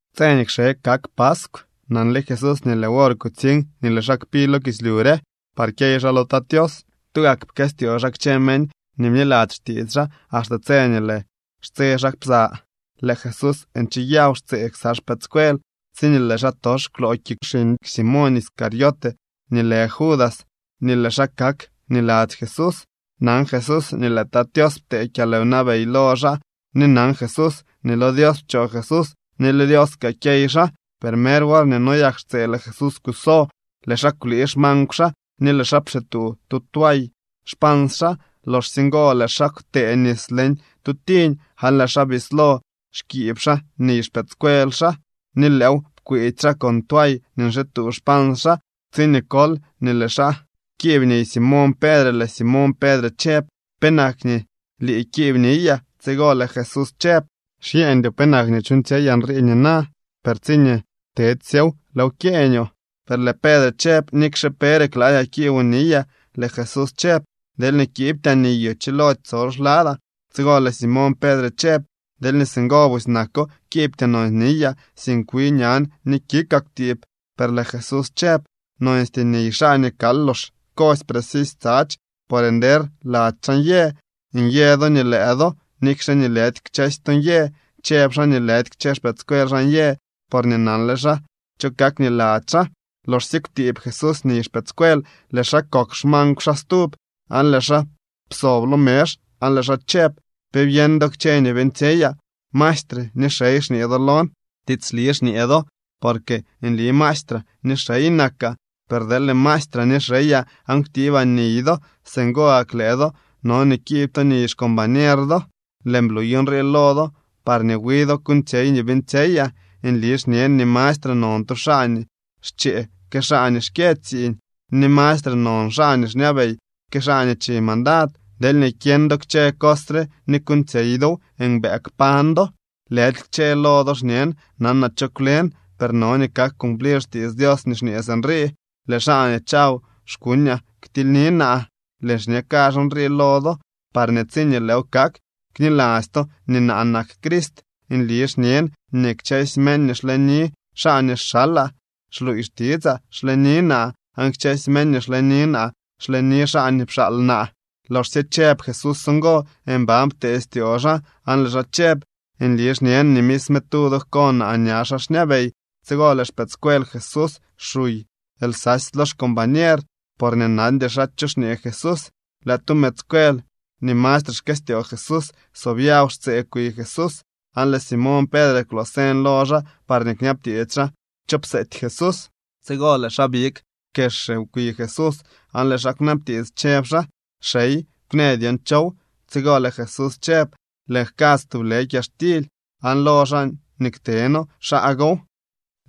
Tse nii kxe kak paskw, nanle Jesús nii lëë wor kutsiñ nii lëë xaa kpi lo kislyu re par kyey xaa lo Tat Tios. Tugak pkëstyoo xaa kchë meñ nii bniladzy xtiits xaa axte tse nii lëë xtse xaa psa. Lëë Jesús ncheyaw xtsee ksa xpëëdscuel tsiñee lëë xaatox kwloo kik xiñ Simoñ Iscariote nii lë Judas nii lëë xaa kak niladzy Jesús. Nan Jesús nii lëë Tat Tios ptee kyalwnabey lo xaa ni nan Jesús nii lo Dios pchoo Jesús ni lo Dios kaa kyey xaa. Per mer worñee noyak xtsee lëë Jesús kuso, lëë xaa kwlii xmankw xaa ni lëë xaa pxituu tu tway xpans xaa. Loxsye ngo lëë xaa kwtëë nis leñ tu tiñ aan lëë xaa bislo xkiib xaa niy xpëëdscuel xaa ni lëëw pkwiitsy xaa con tway nii nxituu xpans xaa. Tsiñee kol nii lëë xaa kiib niy Simoñ Pedre, lëë Simoñ Pedre chëb: —¿Penak nii lii kiib niyaa? Tsigo lëë Jesús chëb: —Xyeeñdyoo penak nii chuuñtsyeyaa nrii nina, per tsiñee tedsyo, lëëw kyeeñoo. Per lëë Pedre chëb: —Nikxe pere kladyaa kiiboo niyaa. Lëë Jesús chëb: —Deelñee kiibtyaa niyoo chilody tsol xladaa. Tsigo lëë Simoñ Pedre chëb: —Deelñee singo busy nako, kiibtyoo nonsy niyaa, sink wi ñan ni kikaa kwtiib. Per lëë Jesús chëb: —Nonstyee niy xaa nii kal lox kosy precisy tsadx, por nder lady xaa nyë. Nyë do nii lëë do, nikxe nii lëdy kchësy to nyë. Chëb xaa nii lëdy kchë xpëëdscuel xaa nyë, porñee nanle xaa cho kak niladzy xaa. Loxsye kwtiib Jesús niy xpëëdscuel, lëë xaa kokw xmankw xaa stub, aan lëë xaa psob lo mezh aan lëë xaa chëb: —¿Pe byeñ do kchë nii beeñtsyeyaa? Maestre ni xey xñee do lon. Tiitsli xñee do, porque nli maestraa ni nli xey nakaa. Per deel maestraa ni xeyaa aan kwtiibaa niy do, singo gak lëë do no nii kiib to niy xcombañer do. Lëën bluy nrii lo do parñee wi do kuuñtsyey nii beeñtsyeyaa. Nli xñen nii mastre non tu xaa nii xchee que xaa nii xkyë tsiiñ, ni mastre non xaa nii xñabey que xaa nii chi mandad. Deelñee kyeñ do kchë cos re ni kuuñtsyey dow, mbëë kpañ do. ’Lëdy kchë lo do xñen. Nanaa cho kwlen. Per no nii kak cumplir xtiits Dios nii xñee sinrii: “Lëë xaa nii chaw xkuñaa ktilyni naa.” Lëën xñe kazh nrii lo do parñee tsiñee lëëw kak, kniladzy to nii naa nak Crist. Nli xñen nii kchësy meñ nii xleni xaa nii xalaa xluuy xtitsaa, xleni naa. Aan kchësy meñ nii xleni naa, xleni xaa nii pxaal naa. Loxsye chëb Jesús ngo, mban ptee styoo xaa, aan lëë xaa chëb: —Nli xñen nii misme tu do jko naa ña xaa xñabey. Tsigo lëë xpëëdscuel Jesús xuy lsasy lo xcombañer, porñee nandy xaa cho xñee Jesús. Lëë tu mëëdscuel nii mastre xkëstyoo Jesús sobyaw xtsee kwi Jesús, aan lëë Simoñ Pedre kwloo señ lo xaa parñee kñabtiits xaa cho pseety Jesús. Tsigo lëë xaa big kexre kwi Jesús aan lëë xaa kwnabtiits, chëb xaa: —Xey, kwnë dyon chow. Tsigo lëë Jesús chëb: —Lëën jkadz tublë kyaxtily, aan lo xaa nii kteno, xaa gow.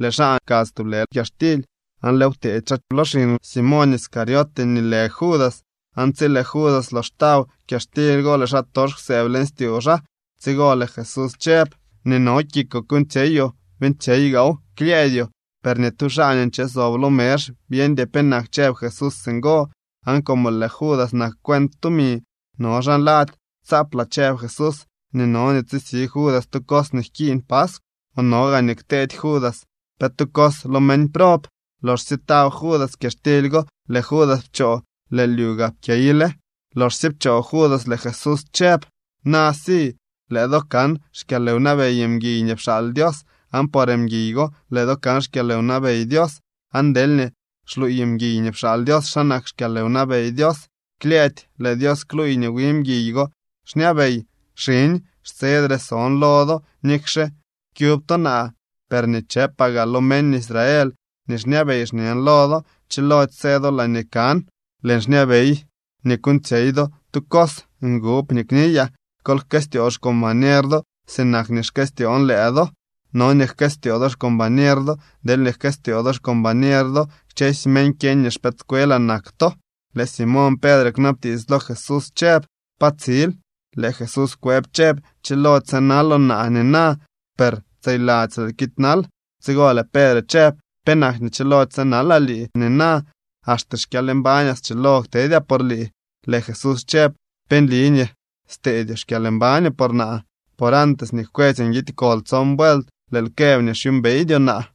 Lëë xaa pkadz tublë kyaxtily aan lëëw pteedy xaa lo xiñ Simoñ Iscariote nii lë Judas. Aan tsi lëë Judas lox taw kyaxtily go, lëë xaatox kwsëëb leñ styoo xaa. Tsigo lëë Jesús chëb: —Nii no kikoo kuuñtsyeyoo, beeñtsyey gaaw klyëëdyoo. Per ni tu xaa nii nche sob lo mezh byeñdy penak chëb Jesús singo. Aan como lëë Judas nak cuent tumi, no xaa nladzy tsaaplaa chëb Jesús nii no nii tsisi Judas tu cos nii jkiiñ paskw, o no gaa nii kteedy Judas pe tu cos lo meñ prob. Loxsye taw Judas kyaxtily go, lëë Judas pchoo. Lëë lyu gaa pkyeyle. Loxsye pchoo Judas, lëë Jesús chëb: —Na si lëë do kan xkyalwnabey mguiy nii pxaal Dios, aan por mguiy go lëë do kan xkyalwnabey Dios. Aan deelñee xluuy mguiy nii pxaal Dios xa nak xkyalwnabey Dios, klyëëdy lëë Dios kluuy nii wi mguiy go xñabey. Xiñ, xtsedre son lo do. Nikxe kyub to naa, per nii chëpaa gaa lo meñ Israel nii xñabey, xñen lo do: Chilody së do laañee kan. Lëën xñabey nii kuuñtsyey do tu cos ngub nii kniyaa: Kol jkëstyoo xcombañer do. Sinak nii xkëstyoon lëë do, no nii jkëstyoo do xcombañer do. Deelñee jkëstyoo do xcombañer do, kchësy meñ kyeñ nii xpëëdscuelaa nak to. Lëë Simoñ Pedre kwnabtiits lo Jesús chëb: —¿Pa tsil? Lëë Jesús kwëb chëb: —Chilody sënaloo naa nina, per tseyladzy lëël kiidnal. Tsigo lëë Pedre chëb: —¿Penak nii chilody sënalaa lii nina? Axte xkyalmbañaa schilo ktedyaa por lii. Lëë Jesús chëb: —¿Pe nli nii steedyoo xkyalmbañoo por naa? Por antes nii jkwetsy nguidy kol tson vuelt, lëël këb nii xyuumbeydyoo naa.